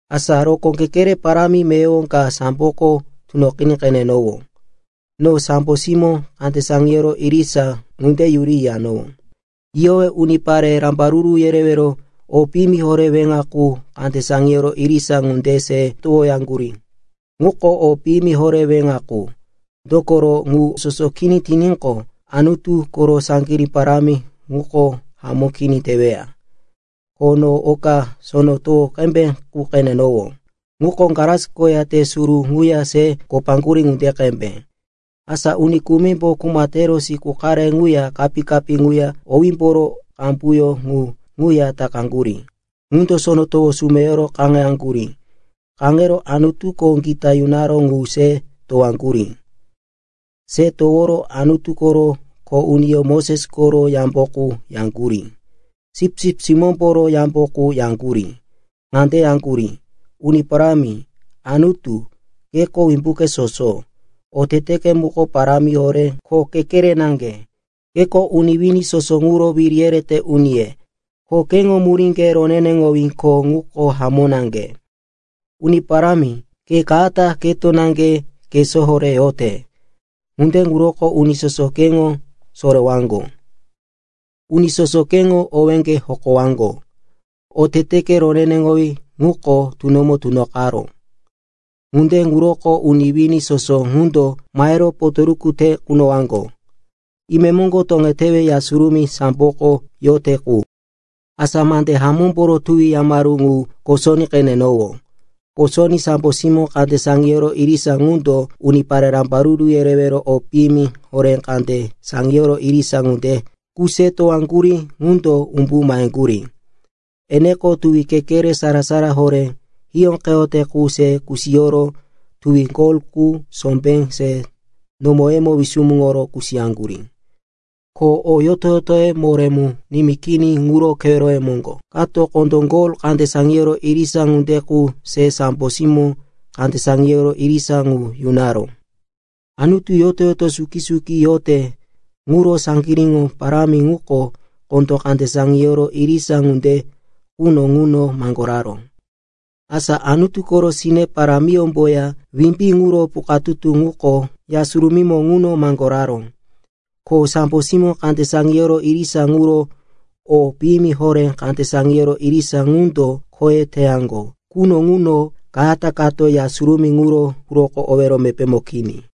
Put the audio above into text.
Asa rokó kekere parámi meyowo ka samboko tunoqiní qenenowó. No sambo simó kande saŋiyoro irisa ŋunde yuri yiyanowó. Yiyowe unipare rambaruru yerewero o piyimi horé weŋa qu kande saŋiyoro irisa ŋunde se towoyaŋgurí. Ŋuko o piyimi horé weŋa qu, dokoro ŋu soso kini tiníqo, Anutu koro saŋgirí parámi ŋuko hamó kini teweya. Ko no oka sono towo qembe qu qenenowó. Ŋuko glas koya te suru ŋuya se kopaŋgurí ŋunde qembe. Asa uni kumimbo kuma tero siku qare ŋuya kapí-kapí ŋuya owímboro qambuyó ŋu ŋuya takaŋgurí, ŋundo sono towo sumeyoro kaŋeyaŋgurí. Kaŋero Anutuko gita yunaró ŋu se towoyaŋgurí. Se toworo Anutu koro kho uniyó Moses koro yambo qu yaŋgurí, Sipsip Simómboro yambo qu yaŋgurí. Ŋande yaŋgurí, “Uni Parámi, Anutu, keko Wimbuke Soso, oteteke muko parámi horé ko kekere naŋge. Keko uni wini soso ŋuro wiri yerete uniye, ko keŋo muríŋge roneneŋowí ko ŋuko hamó naŋge. Uni Parámi, ke kayata keto naŋge kesó horé yote. Ŋunde ŋuroko uni soso keŋo sorewaŋgo. Uni soso keŋo owéŋge hokowaŋgo. Oteteke roneneŋowí ŋuko tunomo tunoqaró. Ŋunde ŋuroko uni wini soso ŋundo mahero potoruku te kunowaŋgo.” Imemoŋgo toŋetewe Ya Surumí samboko yote qu, asa mande hamómboro tuwi yamaru ŋu kosoní qenenowó. Kosoní sambo simó kande saŋiyoro irisa ŋundo unipare rambaruru yerewero o piyimi horé kande saŋiyoro irisa ŋunde qu se towaŋgurí ŋundo umbu maheŋgurí. Eneko tuwi kekere sara-sara horé hiyóqeyote qu se kusiyoro tuwi gol qu sombé se nomoye wisumuŋoro kusiyaŋgurí. Ko o yoto-yotoye moré mu nimí kini ŋuro keweroye moŋgo kato kondó gol kande saŋiyoro irisa ŋunde qu se sambo simó kande saŋiyoro irisa ŋu yunaró. Anutu yoto-yoto suki-suki yote ŋuro saŋgiríŋo parámi ŋuko kondó kande saŋiyoro irisa ŋunde quno ŋuno maŋgoraró. Asa Anutu koro sine parámiyómboya wimbí ŋuro pukatutu ŋuko Ya Surumímo ŋuno maŋgoraró. Ko sambo simó kande saŋiyoro irisa ŋuro o piyimi horé kande saŋiyoro irisa ŋundo khoye teyaŋgo quno ŋuno kayata kato Ya Surumí ŋuro quroko owero mepémo kini.